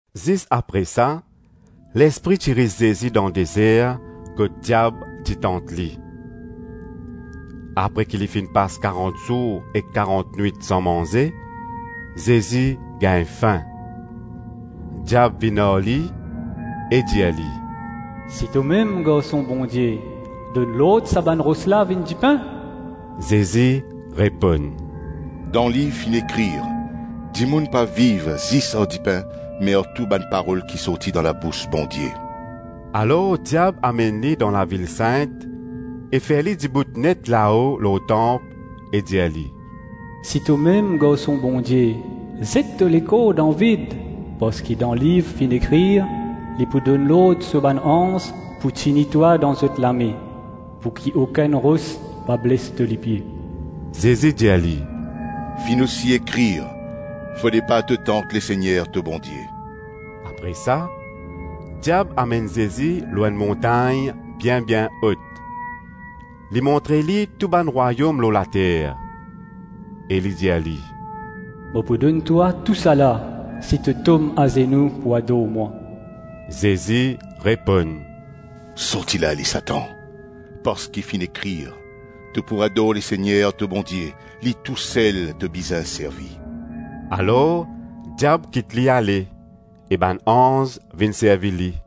Zis apre sa, Lespri ti ris Zezi dan dezer kot diab ti tant li. Apre ki li finn pas karant zour ek karant nwit san manze, Zezi gagn fin. Diab vinn ar li e dir li, “Si tomem Garson Bondie, donn lord sa bann ros la vinn dipin.” Zezi reponn, “Dan liv finn ekrir: ‘Dimoun pa viv zis ar dipin me ar tou bann parol ki sorti dan labous Bondie.’” Alor diab amenn li dan lavil sint e fer li dibout net lao lor tanp e dir li, “Si tomem Garson Bondie, zet to lekor dan vid, parski dan liv finn ekrir: ‘Li pou donn lord so bann anz pou tini twa dan zot lame, pouki okenn ros pa bles to lipie.’” Zezi dir li, “Finn osi ekrir: ‘Fode pa to tant Lesegner to Bondie.’” Apre sa, diab amenn Zezi lor enn montagn bien-bien ot, li montre li tou bann rwayom lor later e li dir li, “Mo pou donn twa tousala, si to tom azenou pou ador mwa.” Zezi reponn, “Sorti la ale Satan, parski finn ekrir: ‘To pou ador Lesegner to Bondie, li tousel to bizin servi.’” Alor diab kit li ale, e bann anz vinn servi li.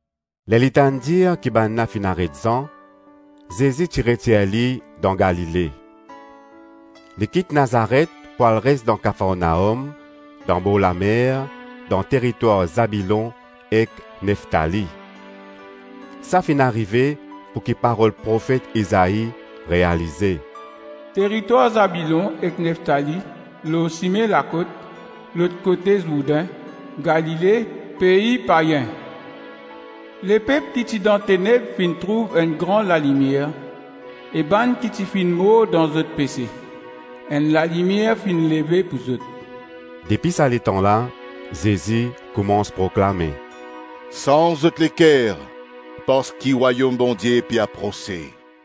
Ler li tann dir ki bannla finn aret Zan, Zezi ti retir li dan Galile Li kit Nazaret pou al res dan Kafarnaom, dan borlamer, dan teritwar Zabilon ek Neftali. Sa finn arive, pouki parol Profet Izai realize: “Teritwar Zabilon ek Neftali, lor sime lakot, lot kote Zourdin, Galile, pei payin; lepep ki ti dan teneb finn trouv enn gran lalimier e bann ki ti finn mor dan zot pese, enn lalimier finn leve pou zot.” Depi sa letan la Zezi koumans proklame, “Sanz zot leker, parski Rwayom Bondie pe aprose.”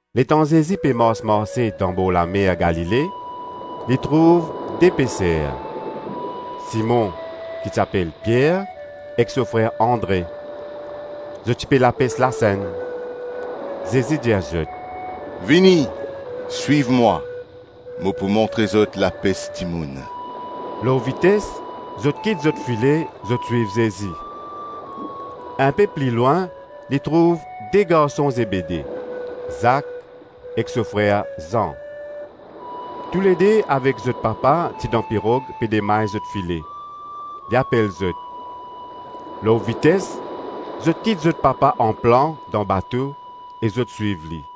Letan Zezi pe mars-marse dan borlamer Galile, li trouv de peser: Simon, ki ti apel Pier ek so frer Andre; zot ti pe lapes lasenn. Zezi dir zot, “Vini, swiv mwa, mo pou montre zot lapes dimoun.” Lor vites, zot kit zot file, zot swiv Zezi Inpe pli lwin, li trouv de garson Zebede: Zak ek so frer Zan. Toulede avek zot papa ti dan pirog pe demay zot file; li apel zot. Lor vites zot kit zot papa anplan dan bato e zot swiv li.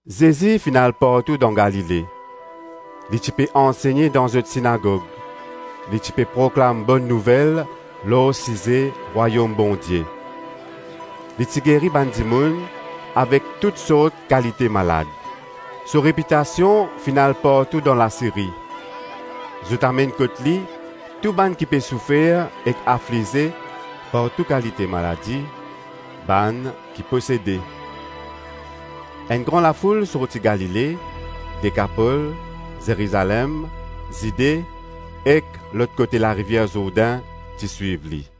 Zezi finn al partou dan Galile, li ti pe ansegne dan zot sinagog, li ti pe proklam Bonn Nouvel lor size Rwayom Bondie. Li ti geri bann dimoun avek toutsort kalite malad. So repitasion finn al partou dan Lasiri. Zot amenn kot li tou bann ki pe soufer ek aflize par tou kalite maladi; bann ki posede. Enn gran lafoul sorti Galile, Dekapol, Zerizalem, Zide ek lot kote larivier Zourdin ti swiv li.